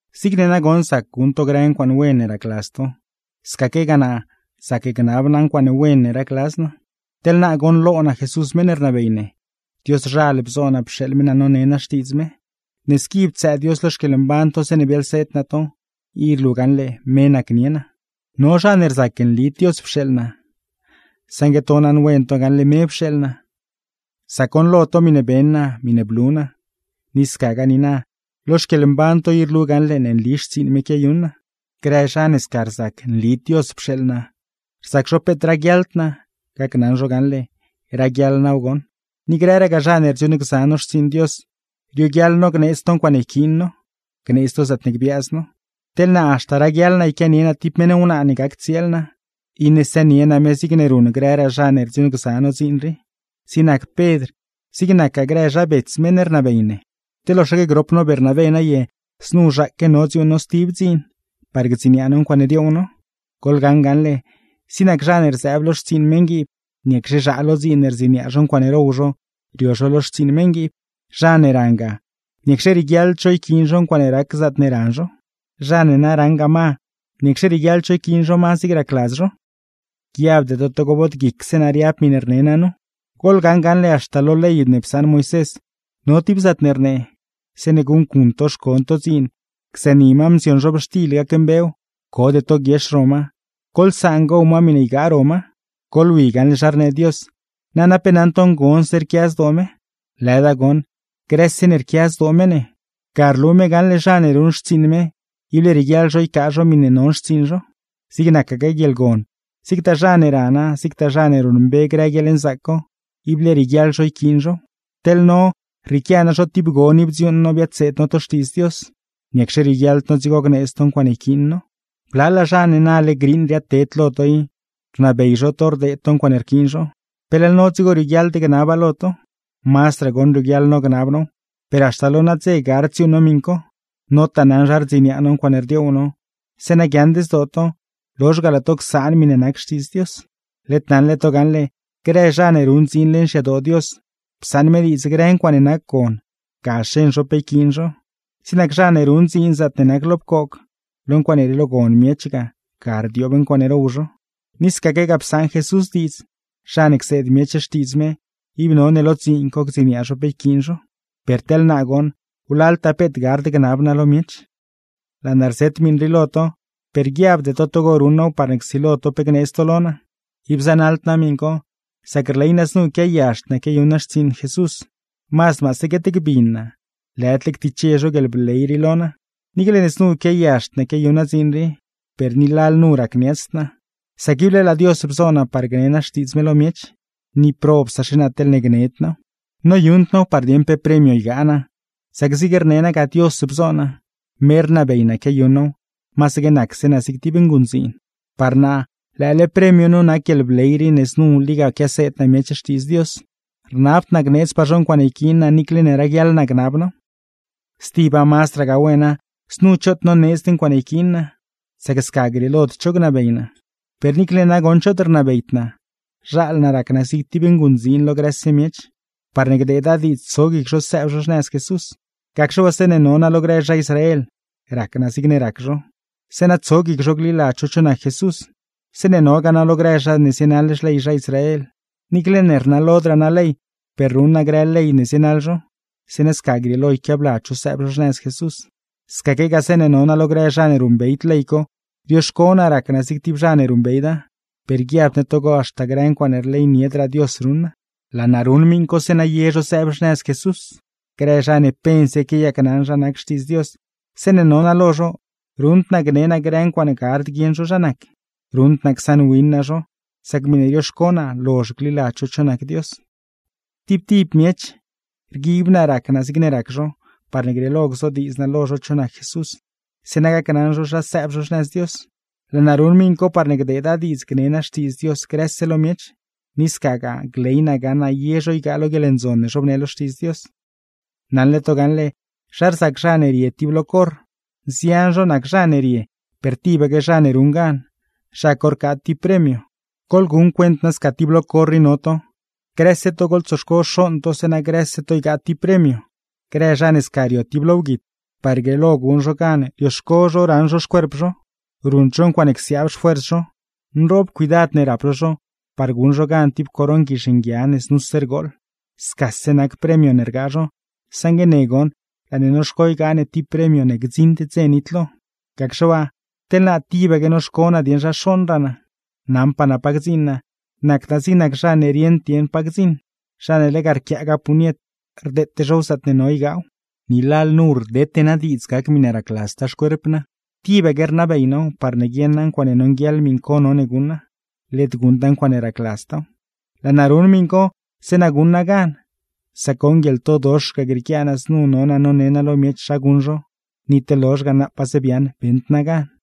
Zigne nagoṉ zac guṉ to grë ncuaaṉe wen ne racladz to, scaquegaa naa, zac gnab naa ncuaaṉe wen ne racladz naa. Teḻ naa goṉlo naa Jesús meṉ ne rnabey ne, Dioszhal bzo naa pxeeḻ me naa none naa Xtiidz me. Ne squi ptsëë Dios lo xquieḻmban to zeeṉe biaḻseed naa to, i rlu gaṉle me nacnie naa. No zha ne rzac nlid Dios pxeeḻ naa, saṉgue to naṉwen to gaṉle me pxeeḻ naa, sac goṉlo to miṉe beṉ naa, miṉe blu naa; ni scagaa niina, lo xquieḻmban to i rlu gaṉle ne nli xtsiiṉ me quiayuṉ naa. Grë zha ne sca rzac nlid Dios pxeeḻ naa, rzac zho peet raguiaḻd naa, gacnaṉ zho gaṉle: ¡Raguiaḻ naaw goṉ! Ni grëragaa zha ne rdziuuṉgza no xtsiiṉ Dios, rioguiaḻ no gneedz to ncuaaṉe yquiin no, gneedz to zaatne gbiaaz no. Teḻ naa, haxta raguiaḻ yquianie naa tib meṉ wnaa ne gac tsieel naa, iṉe sënie naa me zigne ruṉ grëraa zha ne rdziuuṉgza no dziin rii, zig nac Pedr, zig nacgaa grë zha bets meṉ ne rnabey ne. ¿Te loxaque grop no Bernabé naye znu zhaaque no dziuuṉ no stib dziin, par gdziniaa no ncuaaṉe dioow no? Goḻgaṉ gaṉle, zig nac zha ne rzëëb lo xtsiiṉ meṉguiib, ¿niacxe zhaa lo dziin ne rdziniaa zho ncuaaṉe row zho rio zho lo xtsiiṉ meṉguiib? ¿Zha ne rangaa, niacxe rieguiaḻd zho yquiin zho ncuaaṉe rac zaatne ran zho? ¿Zha ne na raṉgaa ma, niacxe rieguiaḻd zho yquiin zho ma zigne racladz zho? Guiabde to togo bod guicse naa riab miṉe rne naa nu, goḻgaṉ gaṉle haxta lo ley ne psaṉ Moisés no tib zaatne rnee: “Zeeṉe guṉcuṉ to xcon to dziin gzëëni ma mzion zhobxtil gacmbew, code to guiex ro ma, goḻsaan gow ma miṉe ygaa ro ma.” Goḻwi gaṉle zha rnee Dios, nana pe naṉ to ngonse rquia zdoo me. Lëda goṉ, grëse ne rquia zdoo me ne. Ga rlu me gaṉle, zha ne ruṉ xtsiiṉ me, ible rieguiaḻ zho ycaa zho miṉe non xtsiiṉ zho. Zig nacaque guieḻgon, zigtaa zha ne rana, zigtagaa zha ne ruṉmbe grë guieḻnzaac co, ible rieguiaḻ zho yquiin zhow. Teḻ no, rrieequia nazho tib gon i bdziuuṉ no biadseed no to Xtiidz Dios, ¿niacxe rioguiaḻd no dzigo gneedz to ncuaaṉe yquiin no? Blalaa zha ne nale griiṉ riaadted lo to i, rnabey zho to rdeed to ncuaaṉe rquiin zho, ¿pe leḻ no dzigo rioguiaḻd gnaba lo to? Mazdraa goṉ rioguiaḻ no gnab now, per haxta lo nadze gard dziuuṉ no miṉ co, notaa naṉ zha rdziniaa no ncuaaṉe rdioow no; zeeṉa guiaaṉd zdoo to, lozh ga laa to csaan miṉe nac Xtiidz Dios. Led naṉle to gaṉle, grë zha ne ruṉ dziin leṉ xyadoo Dios, psaṉ me diidz grë ncuaaṉe nac gon, ga xeṉ zho pe yquiin zho, zig nac zha ne ruṉ dziin zaatne nac lo pcoog, lo ncuaaṉe rielogon miech ga, ga rdioob ncuaaṉe row zho. Ni scaquegaa psaṉ Jesús diidz, zha ne cseed miech Xtiidz me, ib none lo dziin co gdziniaa zho pe yquiin zho. Per teḻ naa goṉ, wlaltaa peet gard gnab naa lo miech. Laa naa rzet miṉ rii lo to, per guiabde to togo ruṉ naaw parne csilo to pe gneedz to lo naa. Ib zanaḻd naa miṉ co, sac rley naa znu quiayazhd naa quiayuṉ naa xtsiiṉ Jesús, mazd maase guetgbin naa, lëdle ctiche zho guieḻbley rii lo naa. Niicle ne znu quiayazhd naa quiayuṉ naa dziin rii, per ni lalnu racniatsd naa, sacne ible laa Dios bzo naa par gne naa Xtiidz me lo miech; ni, ¡probsaxe naa teḻne gned naaw! Noyuṉd naaw par dieṉ pe premio ygaa naa, sac zig rne naa ga Dios bzo naa, me rnabey naa quiayuṉ naaw, masaque nacse naa zig tib nguṉdziin. Par naa, lëële premio nu nac guieḻbley rii ne znu liga quiaseed naa miech Xtiidz Dios, rnabd naa gneedzpaa zho ncuaaṉe yquiin naa niicle ne raguiaḻ naa gnab naaw. Stiba mazdragaa wena, znu choot noneedzd ncuaaṉe yquiin naa, sac sca grieelod cho gnabey naa; per niicle ne nagoṉ choot rnabeyd naa, zhaal naa rac naa zig tib nguṉdziin lo grëse miech, parne gdeeda diidz tso guic zho sëëb zho xnëz Jesús. Gacxe waa zeeṉe no naa lo grë zha Israel, rac naa zigne rac zho, zeeṉa tso guic zho gliladz zho cho nac Jesús. Zeeṉe nogaa naa lo grë zha ne zienaḻ xley zha Israel, niicle ne rnalodraa naa ley, per ruṉ naa grë ley ne zienaḻ zho, zeeṉa sca grieelo yquiabladz zho sëëb zho xnëz Jesús. Scaquegaa zeeṉe no naa lo grë zha ne ruṉbeyd ley co, rioxco naa rac naa zig tib zha ne ruṉbeyda; per guiabd ne togo haxta grë ncuaaṉe rleyniedraa Dios ruṉ naa. Laa naa ruṉ miṉ co, zeeṉa ye zho sëëb xnëz Jesús. Grë zha ne pense quiayacnaṉ zha nac Xtiidz Dios, zeeṉe no naa lo zho, ruṉd naa gne naa grë ncuaaṉe gard guieṉ zho zha nac, ruṉd naa csaṉwin naa zho, sac miṉe rioxco naa lozh gliladz zho cho nac Dios. Tib tib miech, rguib naa rac naa zigne rac zho, parne grieelo gzodiidz naa lo zho cho nac Jesús, zeeṉa gacnaṉ zho zha sëëb zho xnëz Dios. Laa naa ruṉ miṉ co, parne gdeeda diidz gnee naa Xtiidz Dios grëse lo miech, ni scagaa, gley naa gaṉ naa ye zho ygaa lo guieḻndzon ne zhobnee lo Xtiidz Dios. Naṉle to gaṉle zha rzac zha ne rie tib lo corr, nzian zho nac zha ne rie per tibaque zha ne ruṉ gan, zha co rcaa tib premio. Goḻguṉ cuent nasca tib lo corr i no to, grëse to goḻtsoxco xooṉ to zeeṉa grëse to ygaa tib premio. Grë zha ne sca rio tib lo wguit, par grieelo guṉ zho gan rioxco zho raṉ zho xcuerp zho, ruṉd zho ncuaaṉe csiaab xfuers zho. Nroob cuidad ne rap zho zho par guṉ zho gan tib coron guizh nguia ne znuse rgooḻ. Scase nac premio ne rgaa zho, saṉgue ne goṉ, laa ne noxco ygaa ne tib premio ne gdziṉd dze nitlo. Gacxe waa, teḻ naa tibaque noxco naa dieṉ zha xooṉraa naa. Naṉpaa naa pa gdziṉ naa, nacd naa zig zha ne rieṉd dieṉ pa gdziṉ, zha ne lega rquiaagaa puñet, rdeete zhow zaatne no ygaaw. Ni lalnu rdete naa diidz gac miṉe racladztaa xcuerp naa, tibaque rnabey naaw parne guieṉa ncuaaṉe nonguieḻ miṉ co none guṉa, led guṉda ncuaaṉe racladztaaw. Laa naa ruṉ miṉ co zeeṉa guṉ naa gan, sac goṉ, guieḻtodox ga grieequia naa znu no naa none naa lo miech zha guṉ zho, ni teḻ lozh ga naapaze biaaṉ beṉd naa gan.